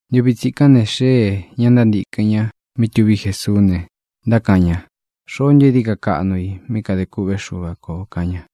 Ntuvi tsikán ne, xéē ña ntántīkɨn ña mí tuví Jesuú ne, ntákaꞌan ña: —¿Xoó ntu é dií ka kaꞌnu i mí kadē kûꞌvé Xuva kō? —kaꞌan ña.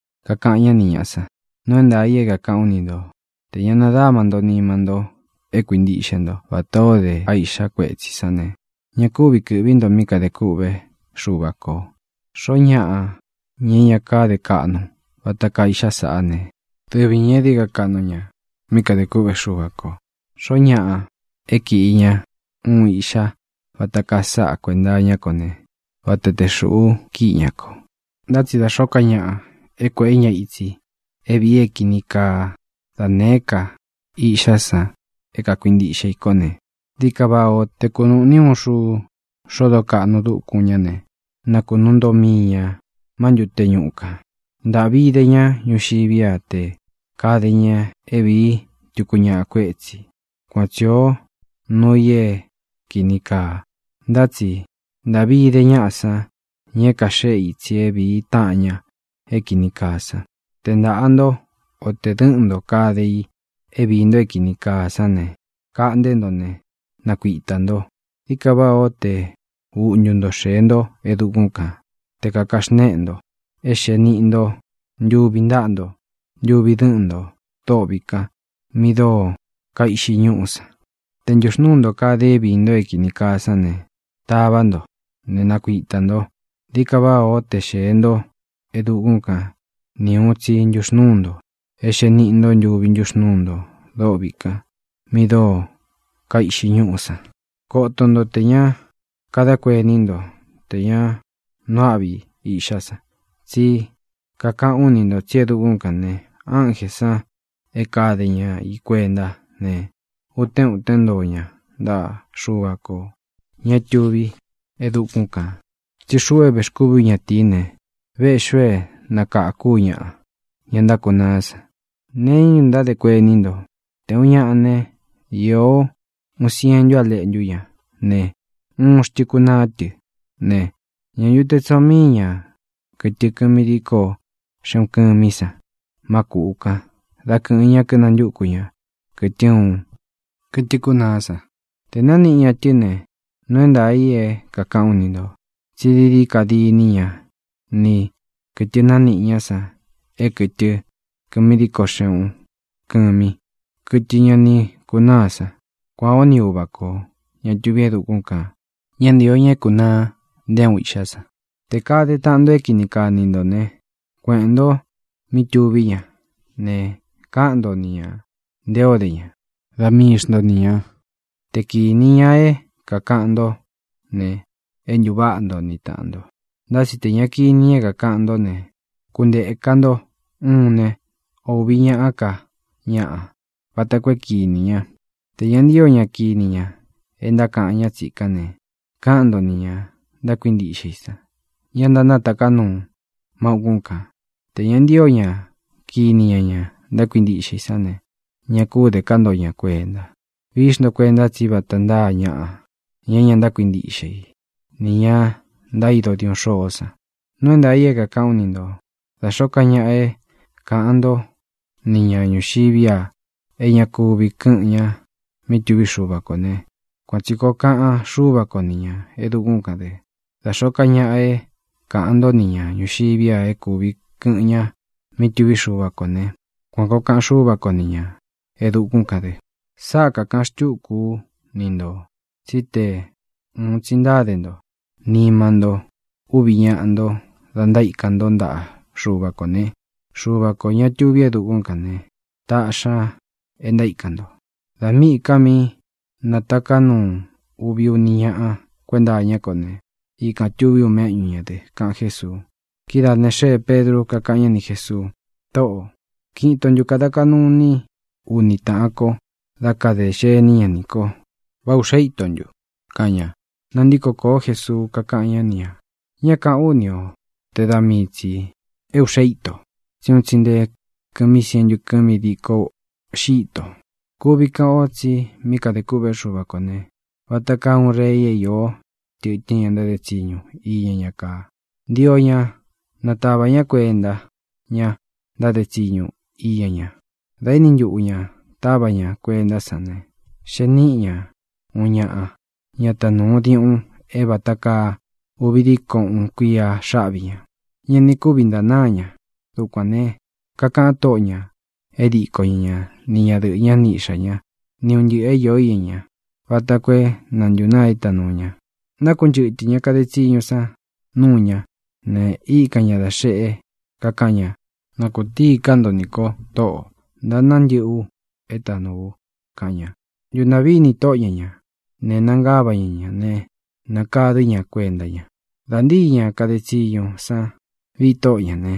Kakaꞌan ñá ni ñāꞌa san: —Nuu é ntaā i é kākaꞌán u ni nto: Tē ña nadáma nto nima nto é kuintiꞌxe nto vatā ó de a iꞌxá kuetsī sán ne, ña kúvi kɨ̄ꞌví nto mí kadē kûꞌvé Xuva kō. Xoó ñaꞌa, ña é ña káde kaꞌnu vata kaa iꞌxa saꞌá ne, dɨvi ñā é dií ka kaꞌnu ña mí kadē kûꞌvé Xuva kō. Xoó ñaꞌa é kiꞌi ña uun iꞌxá vata kaa sáꞌa kuēnta iñá ko ne, vata te xūꞌu kíꞌi ña ko. ʼNtá tsi da xōó ka ñaꞌa é kuēꞌé ña itsi é vīi é kini kaa da nēé ka iꞌxá san é kakuintiꞌxe i kó ne, dií ka váꞌā ó te kunūꞌni uun xuu xodo kaꞌnu dúkun ñá ne, na kunuu ntoꞌo mii ñā má ntute ñuꞌu kān. ¡Ntāꞌvi ide ñá ñuxiví a tē kade ña é vīí tuku ñaꞌa kuétsī! Kuan tsi īó nuu i é kīni kaa, ntá tsi ¡ntāꞌvi ide ñaꞌa san, ña é kaxéꞌe itsi é vīí taꞌan ña é kīni kaa san! ʼTe ntāꞌa nto, o te dɨ̄ꞌɨ́n nto kade i é viī nto é kīni kaa san ne, kaꞌnté nto ne, nakuitā nto. Dií ka váꞌā ó te uꞌntu nto xēe ntó e dukún kān, te kāka xnéꞌe nto, é xēe niꞌi nto ntuvi ntáꞌa nto, ntuvi dɨ́ꞌɨn ntō dôꞌvi kan mi dóo kaiꞌxi ñúꞌú san. Te ntūxnúu nto kade i é viī nto é kīni kaa sán ne, tavá nto ne, nakuitā nto. Dií ka váꞌā ó te xēe ntó e dukún kan ni ūun tsi ntuxnúu nto, é xēe niꞌi nto ntuvi ntúxnūu nto dôꞌvi kan mi dóo kaiꞌxi ñúꞌú san. ʼKoto ntó tē ña kadá kuení nto tē ña nuu áꞌvi iꞌxá san. Tsí kakaꞌán u ni ntō tsí e dukún kān ne, ánjē san é kade ña i kuentá ne, utén utén ntoo ña ntaꞌa Xuva kō, ña é tuví e dukún kān. Tsí xuꞌu é vēxkúvi ú ñatīí ne, véꞌxī u é nakākú u ñaꞌa, ña ntákunaá san. ʼ¿Nee iñá ntu ntádē kuení nto? Te ūun ñaꞌa né, īó uun sientu á leꞌntu ña ne, uun xtɨ kunaa tɨ ne, ¿ñā ntu te tsoo míi ña kɨtɨ kɨmi díko xeꞌun kɨmí san má kūꞌu kan dá kɨ̄ꞌɨn ña kínantúku ña kɨ̄tɨ uun, kɨtɨ kunaá san? Te nāniꞌi ña tɨ́ ne, nuu é ntaā i é kākaꞌán u ni ntō, tsí dií dií ka diní ña ni kɨ̄tɨ nániꞌi ña san é kɨtɨ kɨmi díko xeꞌun kɨmí, kɨtɨ ña ni kunáa san. Kuān ó ni Uva kō, ña tuví e dukún kān. Ñá ntīo ña é kūnaa nté uun iꞌxá san. ʼTē kade taꞌan nto é kini kaa ni ntō né, kueꞌēn ntó mí tuví ña ne, káꞌan nto ni ñā nte o dé ña, da mii xnto ni ñā. Te kīni ña é kākaꞌan ntó ne, é ntūváꞌa nto ni tāꞌan nto. Ntá tsi tē ña kini ña é kākaꞌan ntó ne, kuntēka nto uun ne, ō uvi ñaꞌá ka ñaꞌa vata koo é kīni ña. Tē ña ntío ña kini ña e ntákaꞌan ñá tsīkán ne, káꞌan nto nī ña ntákuintiꞌxe i san, ña ntánataká nuu má ūkún kān. Tē ña ntío ña kini ña ña ntákuintiꞌxe i sán ne, ña kú de ká nto ña kuenta. Vií xnto kuenta tsí vata ntáa ñaꞌa, ña é ña ntákuintiꞌxe i, nī ña ntaído diuꞌun xôó san. ʼNuu é ntaā i é kākaꞌán u ni ntō: Da xōó ka ñaꞌa é kāꞌan ntó ni ñā ñuxiví a e ña kuvi kɨꞌɨn ña mí tuví Xuva kō ne, kuan tsi kōo kaꞌan Xúva ko ni ñā e dukún kān dɨ. Da xōó ka ñaꞌa é kāꞌan ntó ni ñā ñuxiví a é kūvi kɨꞌɨn ña mí tuví Xuva kō né, kuan kōo kaꞌan Xúva ko ni ñā e dukún kān dɨ. ʼSáꞌa kākaꞌan xtúku ú ni ntō tsí te ūun tsi ntáde nto nima ntó uvi ñáꞌa nto da ntaíkan ntó ntaꞌa Xuva kō ne, Xuva kō, ña tuví e dukún kān ne, taꞌxi ña é ntaíkan nto. Dā míꞌī ka mí nataká nuu uvi uni ñáꞌa kuenta iñá ko ne, ikān tuví u méꞌñu ñā dɨ —kaꞌan Jésuu. Kidáā ne, xéē Pedru, kakáꞌan ñá ni Jēsuu: —Tōꞌó, ¿kiꞌin ito ntū kada kaꞌnu iní u ni tāꞌan ko dá kadē xení ña nī ko? ¿Vá ūꞌxe íto ntu? —kaꞌan ña. Nantíko kōó Jesuu, kakáꞌan ñá ni ñā: —Ñá kāꞌán u ni o te da mii tsī é ūꞌxe íto, tsí un tsi nté kɨ̄mí sientu kɨmi díko uꞌxi íto. ʼKuvi kaꞌan ó tsi mí kadē kûꞌvé Xuva kō ne, vata kaa uun rei é iō tɨtɨ́n ña ntáde tsiñu iña ñá kaa. Ntio ña natava ñá kuenta ñá ntáde tsiñu iña ña. Dā éni ntuꞌu ña tāvá ña kuentá san ne, xee níꞌi ña uun ñaꞌa, ña tanūu diuꞌun é vāta kaa uvi diko uun kuía xáꞌvi ñā. Ña ni kúvi ntanáa ña. Dukuān ne, kakaꞌan tóꞌo ñā é diko ña ñā, ni ña dɨꞌɨ̄ ñá, ni iꞌxā ñá, ni un ntɨꞌɨ̄ é īó iña ña, vata koo é na ntūnaa é tanūu ña. Nákunchɨtɨ̄ ña kade tsiñu san núu ñá ne, íkan ña dā xeꞌe, kakaꞌan ña: “Na kūtíi ká nto nī ko, Tóꞌō. Ntanáa ntɨꞌɨ u é tanūu u”, kaꞌan ña. Ntūntaꞌví ini tóꞌo ñā ñá ne, nangava ña ñā né, nakadɨ̄ ñá kuenta ña. Dā ntíi ña kade tsiñu san viꞌi tóꞌo ñā né,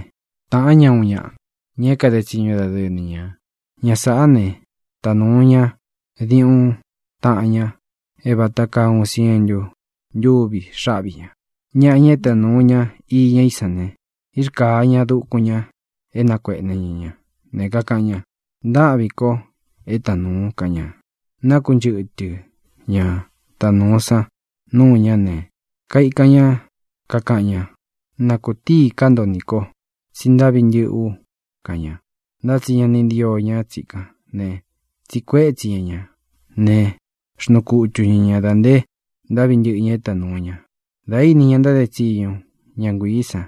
tāꞌán ña uun ñaꞌa, ña é kade tsiñu dadɨɨ ni ñā. Ña sāꞌá ne, tanūu ña diuꞌun taꞌan ña é vāta kaa uun sientu ntúvi xáꞌvi ñā. Ñaꞌa, ña é tanūu ña iña í san ne, írkāa ña dukun ña é nakuēꞌne ña ña ne, kakaꞌan ña: “Ntáꞌvīn ko é tanūun”, kaꞌan ña. Nákunchɨtɨ ña tanūu san núu ñá ne, kaikan ña kakaꞌan ña: “Na kūtíī ká nto nī kó, tsi ntáꞌvi ntɨ̄ꞌɨ́ u”, kaꞌan ña. Ntá tsi ña ni ntío ña tsikán ne, tsiꞌi kuétsi ña ñā ne, xnuu kutu ña ña dā nte ntáꞌvi ña é ita nūu ña. Dā íni ña ntáde tsiñu, ña nguiī san,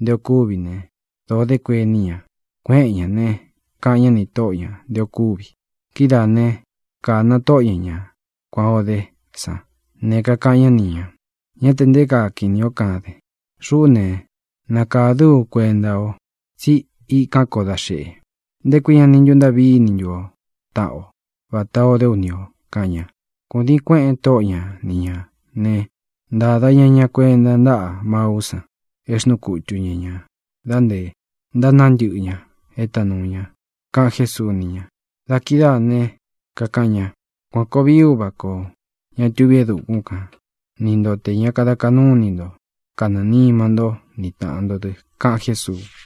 nté ō kúvi ne, dōo dé kuení ña. Kuéꞌen ñā ne, káꞌan ña nī tóꞌo ñā nté ō kúvi. Kidáā né, kāna tóꞌo ña ña kuān ó de sán ne, kakaꞌan ñá ni ñā: “Ñá tē nté kaa kinī ó kaden. Xuꞌú ne, nakādɨ́ u kuenta ó tsi íkān kó da xeꞌe. ¿Nté kui ña ni ntuntaꞌví ini ntu o taꞌan o, vatā o dé u ni ō?”, kaꞌan ña. Kūdiin kuéꞌēn tóꞌo ña ni ñā né, ntāda ña ña kuenta ntáꞌa maú san é xnuu kutu ña ña dā nté ntanáa ntɨꞌɨ ña é tanūu ña —kaꞌan Jésuu ni ña. Da kidáā ne, kakaꞌan ña: —Kuān koo vií Uva kō, ña tuví e dukún kan, ni nto tē ña kada kaꞌnú ini nto kanɨɨ̄ nima ntó ni tāꞌan nto dɨ —kaꞌan Jésuu.